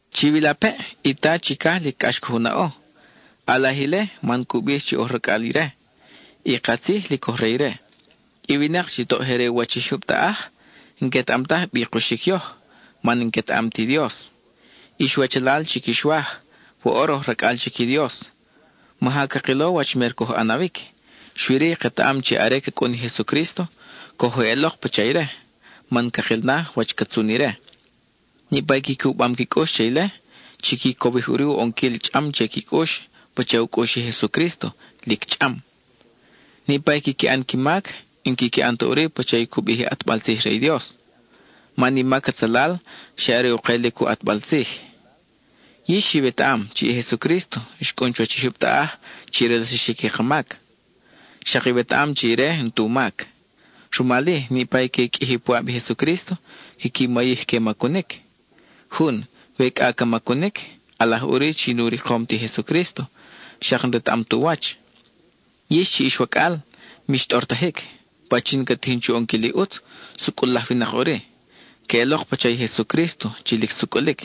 Chiwilapeʼ, i Ta chicaj lic cʼax coj u naʼo; ʼalaj ile, man cu bij chi oj racʼal ire. Y katzij lic oj re ire. I winak chi toʼ je re u wach i jyub taʼaj, n-quetaʼam taj bi kuxic yoj, man n-quetaʼam ti Dios. Ix wachalal chi quix waj, woʼor oj racʼal chic i Dios; maja cakilo wach mer coj ʼanawic, xui-ri, ketaʼam chi are ca cʼun i Jesucrísto, coj eʼelok pacha ire, man cakil na wach ca tzun ire. Niʼpa i qui cubam qui cʼux che ile, chiqui cowij ʼuri u ʼonquil chʼam che qui cʼux pacha u cʼux i Jesucrísto, lic chʼam. Niʼpa i quiqui ʼan qui mac, n-quiqui ʼan ta ʼuri pacha i cu bij i ʼatbal tzij re i Dios; man i mac atzalal, xa are u kelic u ʼatbal tzij. Yix iwetaʼam chi i Jesucrísto xcʼun chuwach i jyub taʼaj chi relsaxic i ka mac. Xak iwetaʼam chi ire n-tu mac. Rumal-i niʼpa i que qʼuiji puʼab i Jesucrísto, quiqui mayij que macunic. Jun, we cʼa ca macunic, ʼalaj ʼuri chi nu rikom ti Jesucrísto, xak n-retaʼam tu wach. Yix chi ix wacʼal, mix tʼortajic, pachin ca tijin chu ʼonquil i ʼutz, sucʼul laj winak ʼuri; queʼelok pacha i Jesucrísto chi lic sucʼulic.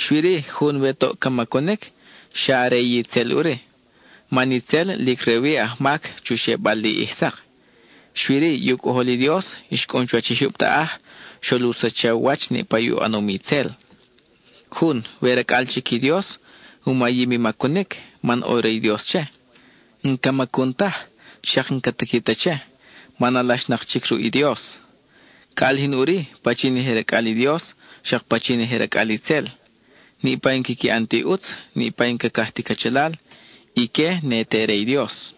Xui-ri jun we toʼ ca macunic, xa re itzel ʼuri, man itzel lic re-wi ajmac chu xebal li ʼij sak. Xui-ri, i u Cʼojol i Dios xcʼun chuwach i jyub taʼaj, xol u sacha u wach niʼpa u ʼanom itzel. Jun, we racʼal chic i Dios, u mayim i macunic, man ʼo re i Dios che; n-ca macun taj, xak n-ca tiqui ta che, man alaxnak chic ruʼ i Dios. Ca ʼalijin ʼuri, pachin je racʼal i Dios, xak pachin je racʼal itzel: niʼpa i n-quiqui ʼan ti ʼutz, niʼpa i n-cacaj ti cachalal, ique ne te re i Dios.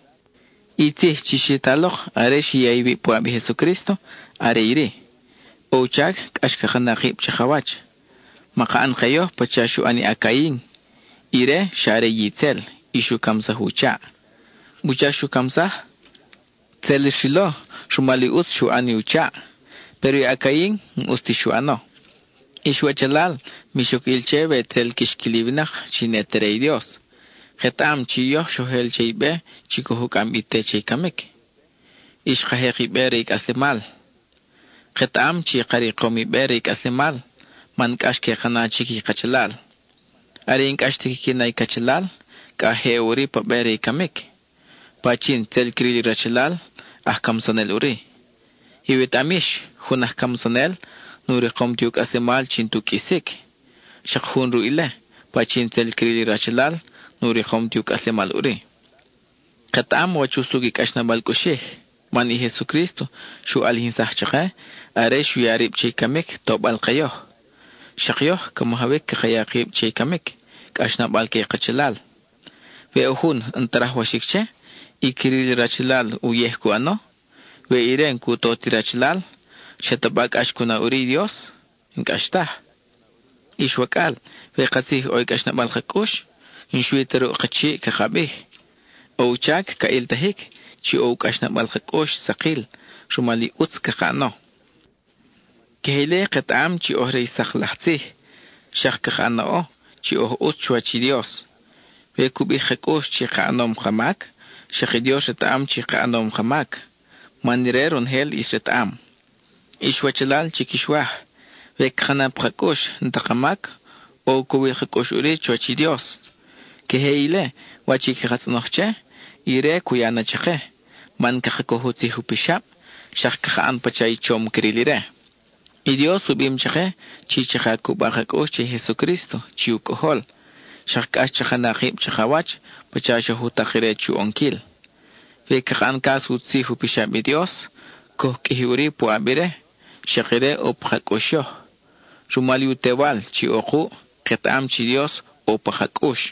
I tzij chi xi ta lok are xi ya iwib puʼab i Jesucrísto, are iri: ʼo u chac cʼax caka na kib chakawach. Maka ʼan ke yoj pacha xu ʼan i a-Cain; ire xa re itzel y xu camsaj u chaʼ. ¿Wuchac xu camsaj? Tzel xrilo rumal i ʼutz xu ʼan i u chaʼ, péro i a-Cain, n-ʼus ti xu ʼano. Ix wachalal, mix oc ʼil che we tzel quix quil i winak chi ne te re i Dios. Ketaʼam chi xoj el che i be chi coj u cʼam bi te che i camic, y xka jek i be re i cʼaslemal. Ketaʼam chi ka rikom i be re i cʼaslemal, man cʼax que ka na chic i kachalal. Are i n-cʼax ta quiqui na i cachalal, cʼa je ʼo ʼuri pa be re i camic. Pachin tzel cril i rachalal, aj camsanel ʼuri. Iwetaʼam yix, jun aj camsanel nu rikom ti u cʼaslemal chi n-tu qʼuisic. (Xak jun ruʼ ile, pachin tzel cril i rachalal, nu rikom ti u cʼaslemal ʼuri.) Ketaʼam wach usucʼ i cʼaxnabal cʼuxij, man i Jesucrísto xu ʼalijinsaj chake are xu ya rib che i camic tobal ke yoj. Xak yoj, ca majawic caka ya kib che i camic, cʼaxnabal que i kachalal. We ʼo jun, n-ta rajwaxic che, y cril i rachalal uyej cu ʼano, we ire n-cu to ti rachalal, ¿xataba cʼax cu na ʼuri i Dios? N-cʼax taj. Ix wacʼal, we katzij ʼo cʼaxnabal ka cʼux, n-xui ta ruʼ ka chiʼ caka bij. ʼO u chac ca ʼiltajic chi ʼo u cʼaxnabal ka cʼux sakil, rumal i ʼutz caka ʼano. Queje ile ketaʼam chi oj re i sak laj tzij, xak caka naʼo chi oj ʼutz chuwach i Dios. We cu bij ka cʼux chi ka ʼanom ka mac, xak i Dios retaʼam chi ka ʼanom ka mac, man ire ronojel ʼis retaʼam. Ix wachalal chi quix waj, we caka na pa ka cʼux n-ta ka mac, ʼo u cowil ka cʼux ʼuri chuwach i Dios. Queje ile wach i caka tzʼonoj che, ire cu ya na chake, man caka coj u tzij u pixab, xak caka ʼan pacha i chom cril ire. I Dios u bim chake chi chaka cuba ka cʼux che i Jesucrísto chi u Cʼojol, xak cʼax chaka na kib chakawach pacha xoj u tak ire chu ʼonquil. We caka ʼan cas u tzij u pixab i Dios, coj qʼuiji ʼuri puʼab ire, xak ire ʼo pa ka cʼux yoj. Rumal i u Tewal chi ʼo kuʼ, ketaʼam chi i Dios ʼo pa ka cʼux.